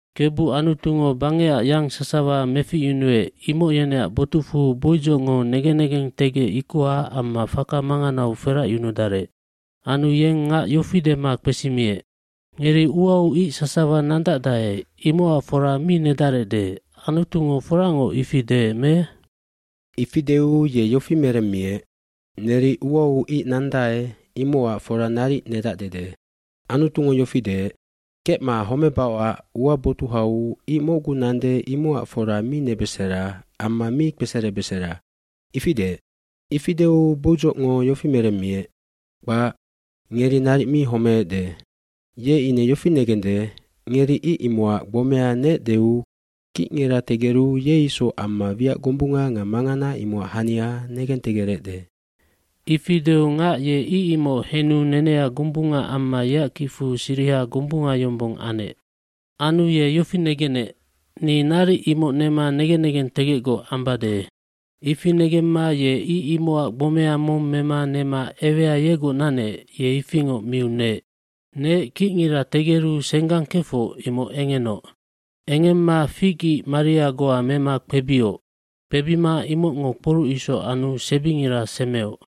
aKebu Anutungo bangecac yang sasawa meficyunuec imoc yeneac botucfu boidzocngo negen negentegec ikoha amma faka manganau feracyunudarec. Anu yeng ngac yofi dema kpesimiec, “Ngeri uau ic sasawa nandacdae imocac fora mi nedarecde, Anutungo foracngoc ifi deec me?” bIfi deu ye yofi meremmiec, “Neri uau ic nandae imocac fora naric nedacdede. Anutungo yofi deec, ‘Kecma homebaocac ua botuhau ic mocgu nande imocac fora mi nebesera amma mi kpeserebesera.’ Ifi deec.” cIfi deu boidzocngo yofi meremmiec, “Kpac, ngeri naric mi homeecde. Ye ine yofi negende, ngeri ic imocac gbomea neecdeu kicngira tegeru ye isoc amma wiac gombunga nga mangana imocac hania negentegerecde.” dIfi deu ngac ye ic imoc henu nenea gombunga amma yeac kicfu siriha gombunga yombong anec. Anu ye yofi negenec, “Ni naric imoc nema negen negentegecgoc ambade.” Ifi negemma ye ic imocac gbomea mong mema nema ewea yegoc nanec ye ifingoc miu neec. fNeec kicngira tegeru senggang kefoc imoc engenoc. Engemma fig ice maria goa mema kpebioc. Kpebima imocngo kporuc isoc anu sebingira semeoc.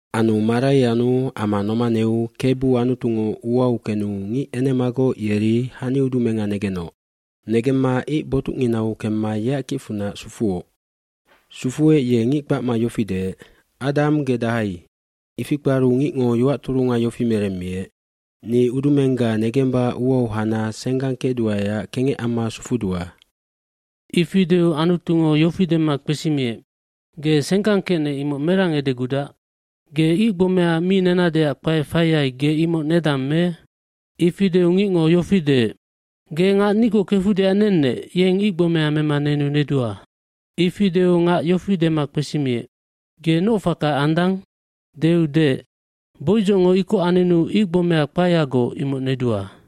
Anu marai anu ama nomaneu Kebu Anutungo uau kenu ngic enemagoc yeri haniudumenga negenoc. Negemma ic botucnginau kemma yeac kicfunac sufuoc. Sufuec ye ngic kpacma yofi deec, “Adam, ge dahai?” Ifi kparu ngicngo yoac turunga yofi meremmiec, “Ni udumengga negemba uau hana senggang kecduaeac kengec amma sufudua.” Ifi deu Anutungo yofi dema kpesimiec, “Ge senggang kecnec imoc merang edegudac? Ge ic gbomea mi nenadeac kpae faiyai ge imoc nedang me?” Ifi deu ngicngo yofi deec, “Ge ngac nigoc kefudeac nennec yeng icgbomea mema nenu nedua.” gIfi deu ngac yofi dema kpesimiec, “Ge noc faka andang?” Deu deec, “Boidzocngo ikoc anenu ic gbomea kpaeyagoc imoc nedua.”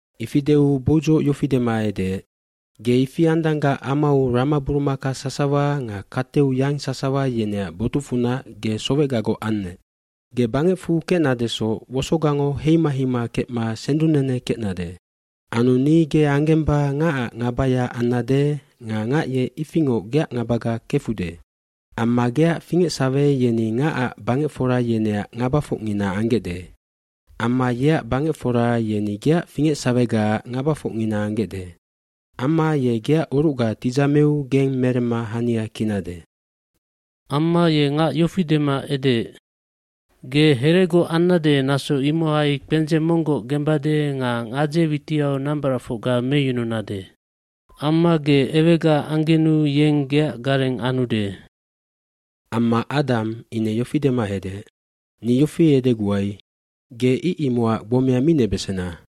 Ifi deu boidzoc yofi dema edeec, “Ge ifi andanggac amau ramaburumaka sasawa nga kateu yang sasawa yeneac botucfunac ge sowecgagoc annec. Ge bangecfu kecnadesoc wosogango heima heima kecma sendungnene kecnade. hAnu ni ge anggemba ngacac ngabaya annade nga ngac ye ifingoc geac ngabaga kefude. Amma geac fingecsahe yeni ngacac bangecfora yeneac ngabafocngina anggecde. Amma yeac bangecfora yeni geac fingecsahegaac ngabafocngina anggecde. Amma ye geac orucga tidzameu geng meremma hania kinade.” iAmma ye ngac yofi dema edeec, “Ge heregoc annade naso imohai kpendzeng monggoc gembade nga gadze witiau nambaracfocga meyununade. Amma ge ewegaac anggenu yeng geac gareng anude.” jAmma Adam ine yofi dema edeec, “Ni yofi edeguai, ‘Ge ic imocac gbomea mi nebesena!’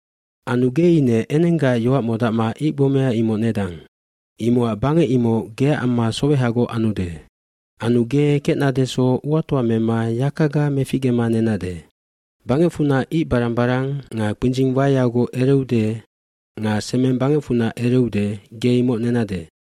Anu ge ine enenggaac yoac modacma icgbomea imoc nedang. Imocac bangec imoc geac amma sowehagoc anude. Anu ge kecnadesoc nga kecbesannecsoc uatoa mema yakaga meficgema nenade. Bangecfunac icbarang barang nga kpindzing waeyagoc ereude nga semeng bangecfunac ereude ge imoc nenade.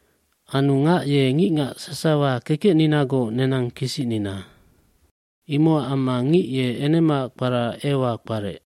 Anu ngac ye ngicngac sasawa kekecninagoc nenang kisicnina. Imocac amma ngic ye enemaac kpara Ewal kparec.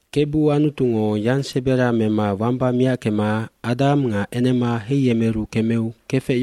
Kebu Anutungo yangsebera mema wamba miackema Adam ngaenema heiyemeru kemeu kefec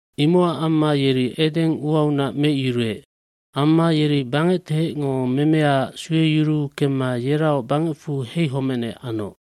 Imocacamma yeri Eden uaunac meicyuruec. Amma yeri bangectehecngomemeaac sueyuruu kemma yeraoc bangecfu heihomecnec anoc.